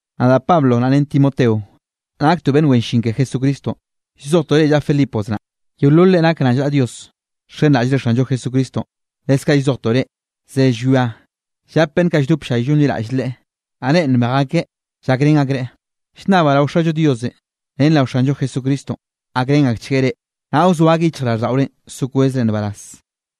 Nadaꞌ Pablo naꞌ ren Timoteo, naktoꞌ beꞌnn wen llin ke Jesucristonꞌ, llzojtoꞌ reꞌ llaꞌa Filipos naꞌ, yeolol reꞌ nak rallnaꞌa Dios nxenraꞌllre Xanllo Jesucristonꞌ. Leskaꞌ llzojtoꞌ reꞌ, ze llwia llap beꞌnn kaꞌ lldop ll-llay llonliraꞌll Leꞌen, naꞌ reꞌ nbej akeꞌ llakrén akreꞌ. Llnnabaꞌ rao Xallo Diosenꞌ ren rao Xanllo Jesucristonꞌ gakrenchgueꞌ reꞌ, naꞌ wzoa akeꞌ yichjraꞌlldaꞌorenꞌ so kwezre nbaraz.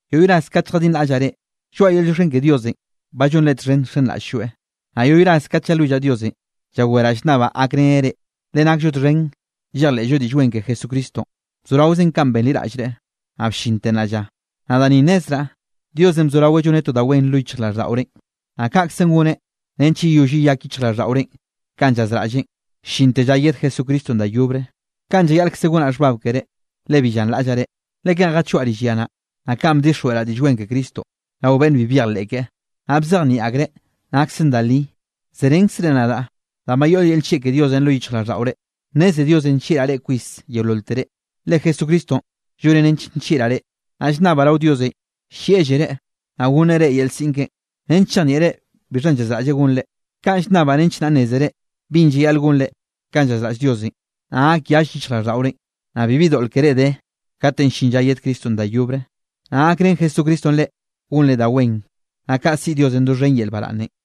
Yoꞌy ras kate lljadinraꞌllaꞌ reꞌ, lloaꞌa yel llioxken ke Diosenꞌ ba llonre txhen nxenraꞌll-lloeꞌ. Naꞌ yoꞌy ras kat llalwillaꞌ Diosenꞌ llaweraꞌ llnnabaꞌ gakreneꞌ reꞌ. Le nakllo txhen llejleꞌllo Diꞌll Wen ke Jesucristonꞌ, bzoraozen kanꞌ benliraꞌllre, naꞌ bllinte nnaꞌ lla. Naꞌ da ni nnezraꞌ, Diosenꞌ bzoraweꞌ lloneꞌ to da wen lo yichjraꞌlldaꞌorenꞌ, naꞌ kaꞌkze goneꞌ nench yeyoll yeyak yichjraꞌlldaꞌorenꞌ kanꞌ llazraꞌlleꞌn, llinte lla yed Jesucristonꞌ da yobre. Kaꞌn llayaꞌlkze gonaꞌ xhbab keré, le bi llanraꞌllaꞌ reꞌ. Le kanꞌ jachoaꞌ rill ya naꞌ, naꞌ kanꞌ bdixjweꞌraꞌ Diꞌll Wen ke Cristonꞌ rao beꞌnn bi byejleꞌ keꞌe, naꞌ bzejnieꞌ akreꞌ naksen da li, zerenkzre nadaꞌ danꞌ ba yoꞌ yel nllieꞌ ke Diosenꞌ lo yichjraꞌlldaꞌore. Nneze Diosenꞌ nllieꞌraꞌ reꞌ kwis yeololtere, le Jesucristonꞌ lloneꞌ nench nllieꞌraꞌ reꞌ. Naꞌ llnnabaꞌ rao Diosenꞌ llieꞌllereꞌ, naꞌ gonneꞌ reꞌ yel siꞌn keꞌen, nench chejnieꞌre bixhanꞌ llazraꞌlleꞌ gonre. Kaꞌn llnnabaꞌ nench naꞌ nnézere binꞌ llayaꞌl gonre kanꞌ llazraꞌll Diosenꞌ, naꞌ gak yall yichjraꞌlldaꞌorenꞌ, naꞌ bibi doꞌl keré de katenꞌ llin lla yed Cristonꞌ da yobre. Naꞌ gakrén Jesucristonꞌ reꞌ gonre da wen, naꞌ kaꞌ siꞌi Diosenꞌ doxhen yel baraꞌnnenꞌ.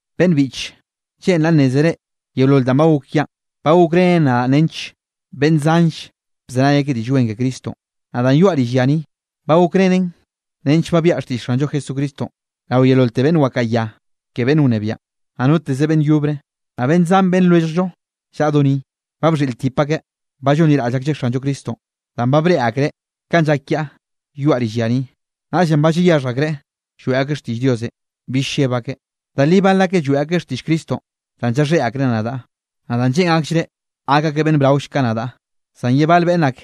Beꞌnn biꞌche, lleꞌnraꞌ nnézere yeolol danꞌ ba gok kiaꞌn, ba gokrenen nench beꞌnn zanll bzenay akeꞌ Diꞌll Wen ke Cristonꞌ. Naꞌ danꞌ yoaꞌ rill ya ni, ba gokrenen nench ba biaꞌa xtiꞌll Xanllo Jesucristonꞌ rao yeololte beꞌnn wakaꞌa ya ke beꞌnn wnebiaꞌn, naꞌ noteze beꞌnn yobre. Naꞌ beꞌnn zan beꞌnn lwelljllo llaꞌa do ni, ba bxhiꞌltip akeꞌ, ba llonliraꞌll aklleꞌ Xanllo Cristonꞌ, danꞌ ba breꞌe akreꞌ kanꞌ llak kiaꞌ yoaꞌ rill ya ni. Naꞌllenꞌ ba llayaxhj akreꞌ lloeꞌ akeꞌ xtiꞌll Diosenꞌ, bill lleb akeꞌ. Da li bal akeꞌ lloeꞌ akeꞌ xtiꞌll Cristonꞌ danꞌ llaxhéꞌ akreꞌ nadaꞌ, naꞌ danꞌ lleꞌn akllreꞌ gak akeꞌ beꞌnn braoll ka nadaꞌ, zan ye bal beꞌnn ak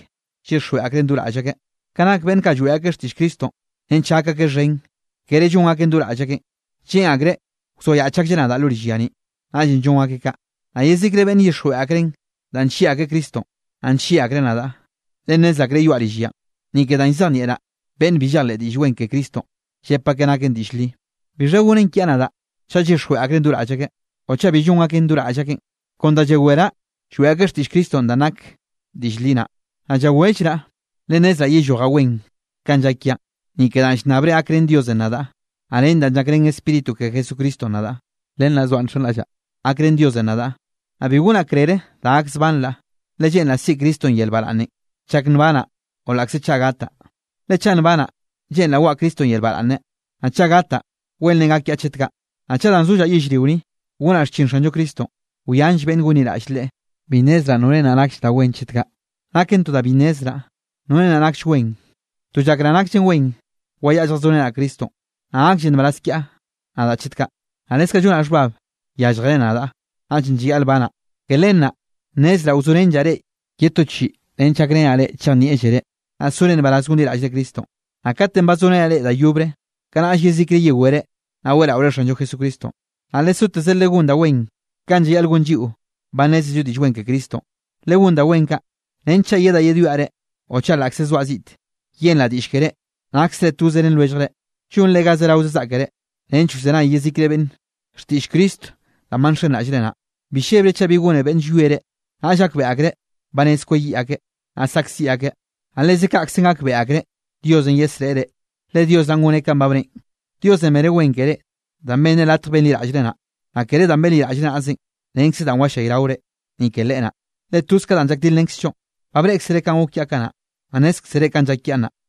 llyixjweꞌ akreꞌn do raꞌll akeꞌ. Ka nake beꞌnn kaꞌ lloeꞌ akeꞌ xtiꞌll Cristonꞌ nench gak akeꞌ xhen, kere llon akeꞌn do raꞌll akeꞌn. Lleꞌn akreꞌ wzoayaꞌch aklleꞌ nadaꞌ lo rill ya ni, naꞌllenꞌ llon akeꞌ kaꞌ. Naꞌ yezikre beꞌnne llyixjweꞌ akreꞌn danꞌ nllieꞌ akreꞌ Cristonꞌ, naꞌ nllieꞌ akreꞌ nadaꞌ, le nnez akreꞌ yoaꞌ rill yanꞌ, ni ke danꞌ llzejnieꞌraꞌ beꞌnn bi llejleꞌ Diꞌll Wen ke Cristonꞌ, llep akeꞌ naken diꞌll li. ¿Bixha gonen kiaꞌ nadaꞌ chaꞌ llyixjweꞌ akreꞌn do raꞌll akeꞌ o chaꞌ bi llon akeꞌn do raꞌll akeꞌn? Kon danꞌ llaweraꞌ lloeꞌ akeꞌ xtiꞌll Cristonꞌ danꞌ nak diꞌll li naꞌ. Naꞌ llawellraꞌ, le nnezraꞌ yellojaꞌ wen kanꞌ llak kiaꞌn, ni ke danꞌ llnnabre gakrén Diosenꞌ nadaꞌ, naꞌ ren danꞌ llakrén Spíritu ke Jesucristonꞌ nadaꞌ. Len naꞌ zoaꞌ nxenraꞌllaꞌ gakrén Diosenꞌ nadaꞌ, naꞌ bi gonaꞌ krere da gakzbanraꞌ, le lleꞌnraꞌ siꞌi Cristonꞌ yel baraꞌnnenꞌ chak nbanaꞌ o laꞌkze chaꞌ gataꞌ. Le chaꞌ nbanaꞌ, lleꞌnraꞌ waꞌa Cristonꞌ yel baraꞌnne, naꞌ chaꞌ gataꞌ wenrenꞌ gak kiaꞌ chet kaꞌ. Naꞌ chaꞌ danꞌ sollaꞌ yellrio ni, gonaꞌ xchin Xanllo Cristonꞌ, wyanll beꞌnn gonliraꞌll Leꞌe, bi nnezraꞌ norenꞌ naꞌ nakll da wen chet kaꞌ. Naken to bniꞌ nnezraꞌ norenꞌ naꞌ nakll wen, to llakraꞌ nakllen wen wayaꞌa lljazorenaꞌ Cristonꞌ, naꞌ gaklle nbaraz kiaꞌ nadaꞌ chet kaꞌ. Naꞌ leskaꞌ llonaꞌ xhbab, yálljere nadaꞌ, naꞌllenꞌ llayaꞌl banaꞌ. Ke len naꞌ, nnezraꞌ wzorenllaꞌ reꞌ ye to chiꞌi nench gakrenaꞌ reꞌ chejnieꞌllere, naꞌ sore nbaraz gonliraꞌllre Cristonꞌ. Naꞌ katenꞌ ba zorenaꞌ reꞌ da yobre, kanaꞌll yezikre yewere, naꞌ weꞌraore Xanllo Jesucristonꞌ. Naꞌ lesoteze legón da wen kanꞌ llayaꞌl gonllo lliꞌo ba nneze Diꞌll Wen ke Cristonꞌ. Legón da wen kaꞌ, nench chaꞌ yedaꞌ yedwiaꞌ reꞌ o chaꞌ laꞌkze zoaꞌ ziꞌte, yenraꞌ diꞌlle keré, naksre toze ren lwelljre, llonre ga zerao zaꞌkere nench wzenay yezikre beꞌnne xtiꞌll Cristonꞌ danꞌ ba nxenraꞌllre naꞌ. Bi llebre chaꞌ bi gone beꞌnn llwie reꞌ. Naꞌll gakbeꞌe akreꞌ ba rez kweyiꞌ akeꞌ, naꞌ saꞌkziꞌ akeꞌ. Naꞌ leze kaꞌkzenꞌ gakbeꞌe akreꞌ Diosenꞌ yesreꞌe reꞌ. Le Dios naꞌn goneꞌ kanꞌ ba bneꞌen. Diosenꞌ beneꞌ wen keré, danꞌ benneꞌ latj benliraꞌllreꞌ naꞌ, naꞌ kere danꞌ benliraꞌllreꞌ naꞌzenꞌ, renkze danꞌ wallayraore, ni ke Leꞌe naꞌ. Le toz ka danꞌ llakdilrenkzllo. Ba breꞌkzere kanꞌ gok kiaꞌ kanaꞌ, naꞌ nnézkzere kanꞌ llak kiaꞌ nnaꞌ.